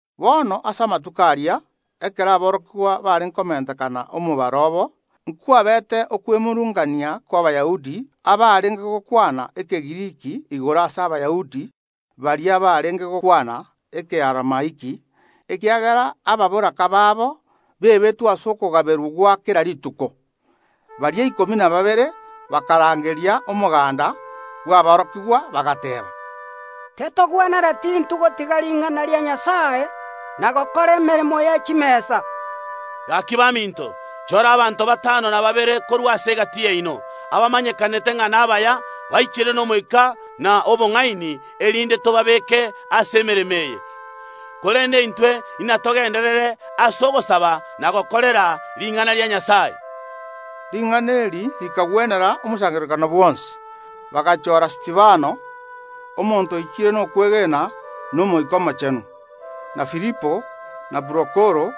Bono ase amatuko aria, ekero aborokigwa barenge komentekana omobaro obo, nkwabeete okwemurungania kw’Abayahudi abarenge gokwana Ekegiriki igoro ase Abayahudi baria barenge gokwana Ekearamaiki, ekiagera ababoraka baabo bebetwe ase okogaberwa gwa kera rituko. Baria ikomi na babere bakarangeria omoganda bw’aborokigwa, bagateeba: “Tetogwenereti intwe gotiga ring’ana ria Nyasae na gokora emeremo ye chimesa. Gaki baminto, chora abanto batano na babere korwa ase egati yaino, abamanyekanete ng’a nabaya, baichire n’Omoika na obong’aini, erinde tobabeeke ase emeremo eye. Korende intwe inatogenderere ase ogosaba na gokorera ring’ana ria Nyasae.” Ring’ana eri rikagwenera omosangererekano bwonsi. Bagachora Stefano, omonto oichire nokwegena na Omoika Omochenu, na Filipo, na Prokoro,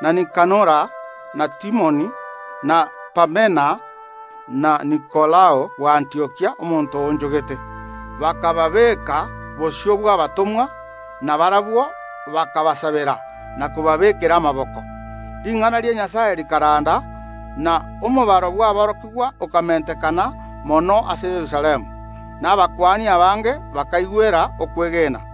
na Nikanora, na Timoni, na Parmena, na Nikolao bw’Antiokia, omonto oonchogete. Bakababeeka bosio bw’abatomwa, na barabwo bakabasabera na kobabeekera amaboko. Ring’ana ria Nyasae rikaranda, na omobaro bw’aborokigwa okamentekana mono ase Yerusalemu, na abakuani abange bakaigwera okwegena.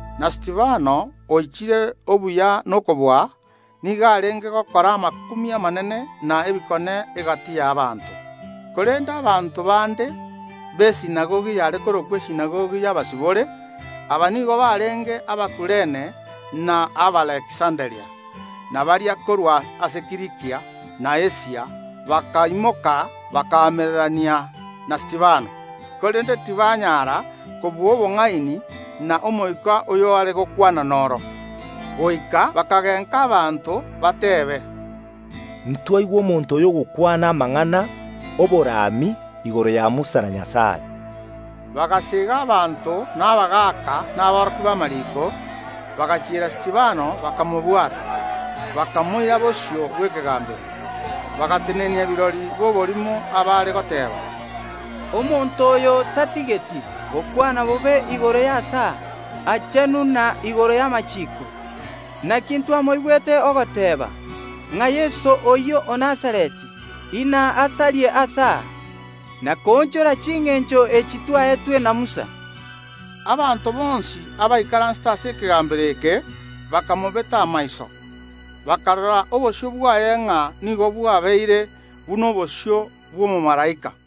Na Stefano, oichire obuya na okobua, nigo arenge gokora amakumia amanene na ebikone egati y’abanto. Korende abanto bande b’esinagogi yare korokwa Esinagogi y’Abasibore, aba nigo barenge Abakuurene na Abaaleksanderia, na baria korwa ase Kilikia na Asia, bakaimoka bakaamererania na Stefano. Korende tibanyara kobua obong’aini na Omoika oyo are gokwana noro. Goika bakagenka abanto bateebe: “Ntwaigwa omonto oyo ogokwana amang’ana ’oborami igoro ya Musa na Nyasae.” Bagaseega abanto na abagaaka na aborokia b’amariiko, bagachiera Stefano bakamobwata, bakamoira bosio bw’ekegambero. Bagatenenia kirori b’oborimo abaare goteeba: “Omonto oyo tatigeti gokwana bobe igoro y’aase Aa Aachenu na igoro y’amachiiko. Naki ntwamoigwa ogoteeba ng’a Yeso oyio o Nazareti inasarie aase aa, na koonchora chingencho echi twaetwe na Musa.” Abanto bonsi, abaikaransete ase ekegambero eke, bakamobeta amaiso, bakarora obosio bwaye ng’a nigo bwabeire buna obosio bw’omomalaika.